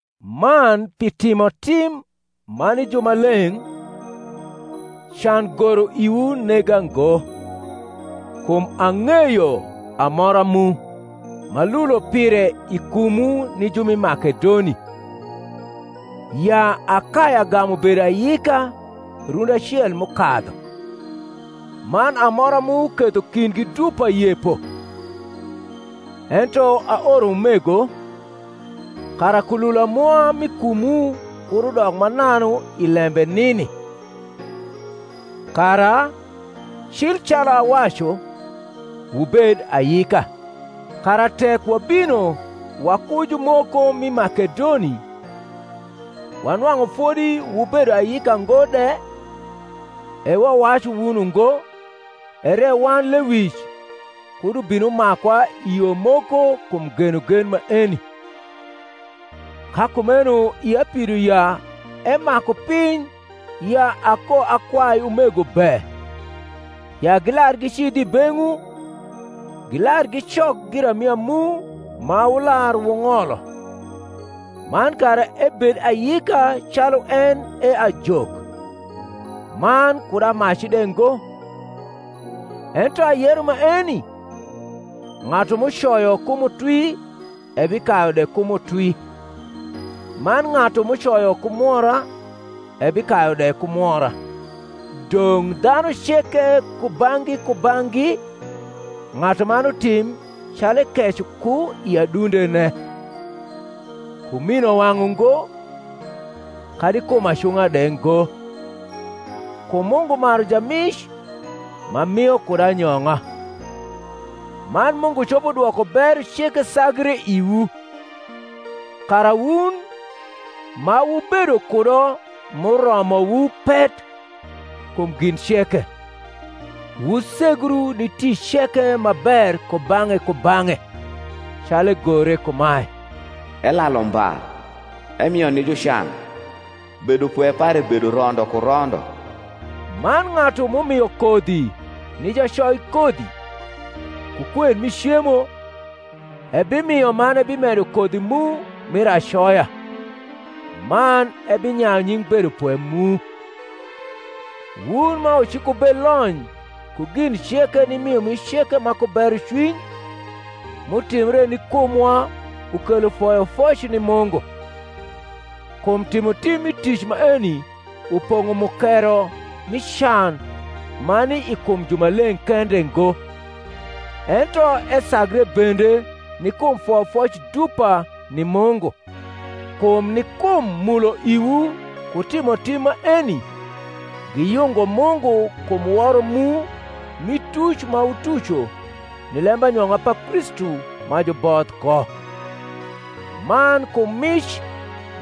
Man pi timotim ma ni jumaleng’, can goro iwu nega ngo: kum ang’eyo amora mu, m’alulo pire i kumwu ni ju ma Makedoni, ya Akaya gamu bedo ayika rundi acel m’ukadhu; man amora mu ketho kindgi dupa yepo. Ento aoro umego, kara kulula mwa m’i kumwu kud udok mananu i lembe nini; kara, cil calu awacu, wubed ayika: kara tek wabino waku jumoko m’i Makedoni, wanwang’u fodi wubedo ayika ngo de, (e wawacu wun ungo) ere wan lewic kud ubin umakwa i yo moko kum genogen maeni. Ka kumeno ia pido ya emaku piny ya akoakwai umego be, ya gilar gicidh i beng’wu, gilar gidok giramia mu ma wular wung’olo, man kara ebed ayika calu en e ajok, man kud amaci de ngo. Ento ayero maeni, ng’atu m’ucoyo ku mutwi ebikayu de ku mutwi; man ng’atu m’ucoyo ku mwora ebikayu de ku mwora. Dong’ dhanu ceke kubang’gi kubang’gi ng’atuman utim calu ekeco ku i adundene: ku minowang’ ungo, kadi kum acung’a de ngo: kum Mungu maru jamic ma mio kud anyong’a. Man Mungu copo dwoko bero ceke sagre iwu; kara wun, ma wubedo kudo m’uromowu pet kum gin ceke, wusegru ni tic ceke ma ber kubang’e kubang’e: calu egore kumae, Elalu mba, emio ni jucan: Bedopwe pare bedo rondo ku rondo. Man ng’atu m’umio kodhi ni jacoikodhi, ku kwen mi cemo, ebimio man ebimedo kodhi mu mir acoya, man ebinyayu nying’ bedopwe mu: wun ma wucikubelony ku gin ceke ni miomic ceke ma ku berocwiny, m’utimbre ni kumwa ukelo foyofoc ni Mungu. Kum timotim mi tic maeni upong’o mukero mi can ma ni i kum jumaleng’ kende ngo, ento esagre bende ni kum foyofoc dupa ni Mungu; kum ni kum mulo iwu ku timotim maeni giyungo Mungu kum woro mu mi tuc ma wutuco ni lembanyong’a pa Kristu ma juboth ko, man kum niic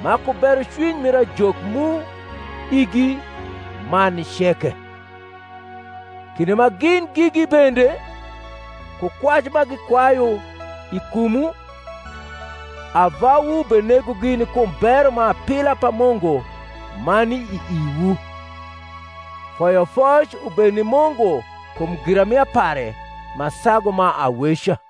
ma ku berocwiny mir ajok mu igi man ni ceke: kinde ma gin gigi bende, ku kwac ma gikwayu i kumwu, ava wu benegogi ni kum bero ma apila pa Mungu ma ni i iwu. Foyofoc ubed ni Mungu kum giramia pare ma sagu ma aweca.